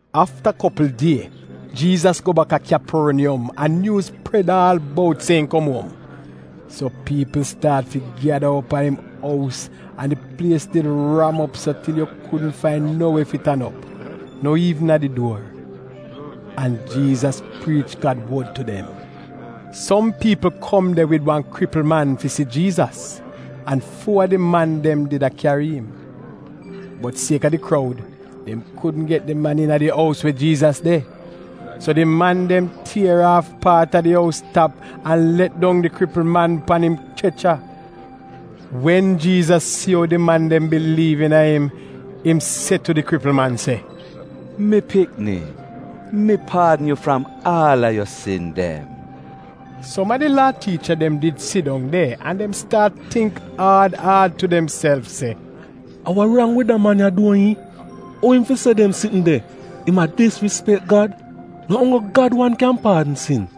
Afta kopl die Jiizas go bak a Kyaporniyom an nyuuz pred aal bout se im kom uom. So piipl staat fi gyada op a im ous an di plies did ram op so til yu kudn fain no we fi tan op, no iivn a di duor. An Jiizas priich Gad wod tu dem. Som piipl kom de wid wan kripl man fi si Jiizas an fuo a di man dem did a kyari im. Bot sieka di kroud, dem kudn get di man iina di ous we Jiizas de. So di man dem tier aaf paat a di ous tap an let dong di kripl man pan im chrecha. Wen Jiizas si ou di man dem biliiv iina im, im se tu di kripl man se, “Mi pikni, mi paadn yu fram aal a yu sin dem.” Som a di Laa tiicha dem did sidong de an dem staat tingk aad aad tu demself se, “A wa rang wid da man ya duo iihn? Ou im fi se dem sitn de? Im a disrispek Gad! No onggl Gad wan kyan paadn sin?”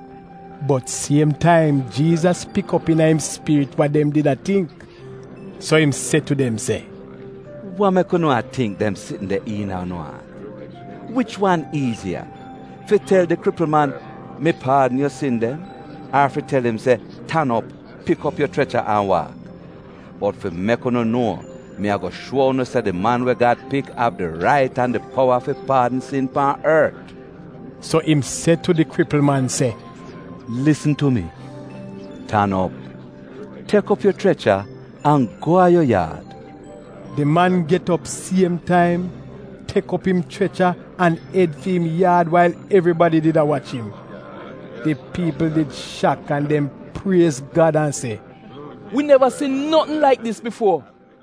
Bot siem taim Jiizas pik op iina im spirit wa dem did a tingk. So im se tu dem se, “Wa mek unu a tingk dem sitn de iina unu aat? Wich wan iiziya, fi tel di kripl man, ‘Mi paadn yu sin dem,’ ar fi tel im se, ‘Tan op, pik op yu chrecha, an waak’? Bot fi mek unu nuo, mi ago shuo unu se di Man we Gad Pik av di rait an di powa fi paadn sin pan ort.” So im se tu di kripl man se, “Lisn tu mi, tan op, tek op yu chrecha, an go a yu yaad.” Di man get op siem taim, tek op im chrecha an ed fi im yaad wail evribadi did a wach im. Di piipl did shak an dem priez Gad an se, “Wi neva si notn laik dis bifuo!”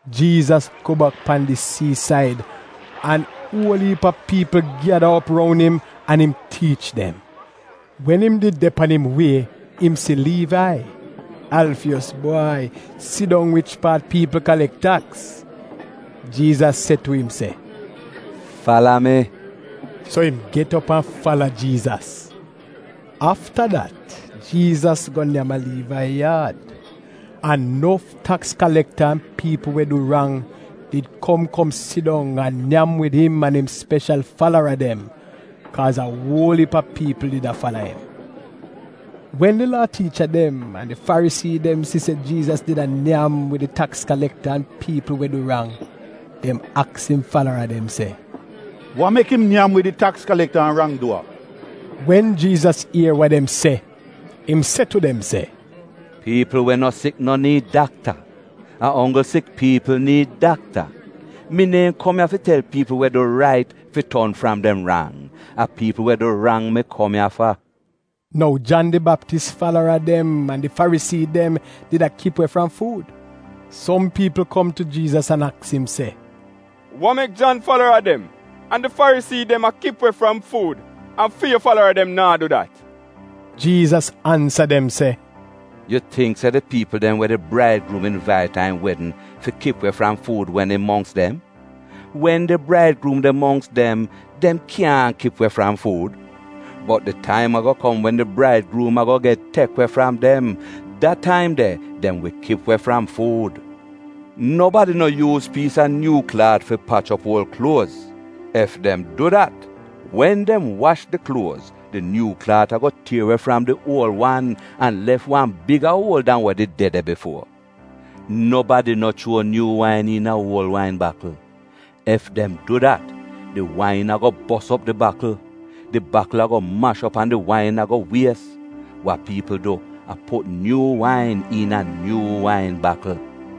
Jiizas go bak pan di siisaid an uol iip a piipl gyada op roun im, an im tiich dem. Wen im did de pan im wie im si Liivai, Alfiyos bwai, sidong wich paat piipl kalek taks. Jiizas se tu im, “Fala mi!” So im get op an fala Jiizas. Afta dat, Jiizas go nyam a Liivai yaad, an nof taks kalekta an piipl we du rang did kom kom sidong an a nyam wid im an im speshal falara dem, kaaz a uol iip a piipl did a fala im. Wen di Laa tiicha dem an di Farisii dem si se Jiizas did a nyam wid taks kalekta an piipl we du rang, dem aks im falara dem se, “Wa mek im nyam wid di taks kalekta an rang-duwa?” Wen Jiizas ier wa dem se, im se tu dem se, “Piipl we no sik no niid dakta, a onggl sik piipl niid dakta. Mi neehn kom ya fi tel piipl we du rait fi ton fram dem rang, a piipl we du rang mi kom ya fa.” Nou Jan di Baptis falara dem an di Farisii dem did a kip we fram fuud. Som piipl kom tu Jiizas an aks im se, “Wa mek Jan falara dem an di Farisii dem a kip we fram fuud an fi yu falara dem naa du dat?” Jiizas ansa dem se, “Yu tingk se di piipl dem we di braidgruum invait a im wedn fi kip we fram fuud wen im mongks dem? Wen di braidgruum de mongks dem, dem kyaahn kip we fram fuud. Bot di taim ago kom wen di gruum ago get tek we fram dem. Da taim de dem wi kip we fram fuud. “Nobadi no yuuz piis a nyuu klaat fi pach op uol kluoz. Ef dem du dat, wen dem wash di kluoz, di nyuu klaat ago tier we fram di uol wan an lef wan biga uol dan wa did de de bifuo. Nobadi no chuo nyuu wain iina uol wain bakl. Ef dem du dat, di wain ago bos op di bakl. Di bakl ago mash op an di wain ago wies. Wa piipl du a put nyuu wain iina nyuu wain bakl.”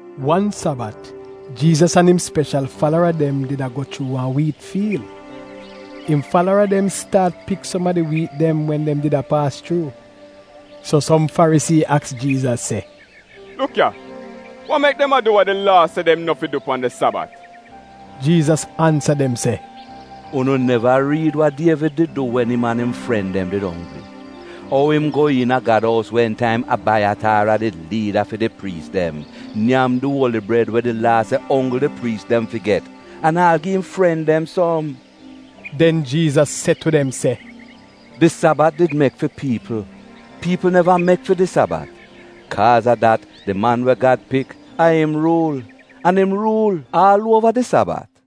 Wan Sabat, Jiizas an im speshal falara dem did a go chuu wan wiit fiil. Im falara dem staat pik som a di wiit dem wen dem did a paas chuu. So som Farisii aks Jiizas, “Luk ya, wa mek dem a du wa di Laa se dem no fi du pan di Sabat?” Jiizas ansa dem se, “Unu neva riid wa Dievid did du wen im an im fren dem did onggri? Ou im go iina Gad ous wen taim Abaiyataar a did liida fi di priis dem, nyam di uoli bred we di Laa se onggl di priis dem fi get, an aal gi im fren dem som?” Den Jiizas se tu dem se, “Di Sabat did mek fi piipl, piipl neva mek fi di Sabat. Kaaz a dat Di Man we Gad Pik, a im ruul. An im ruul aal uova di Sabat.”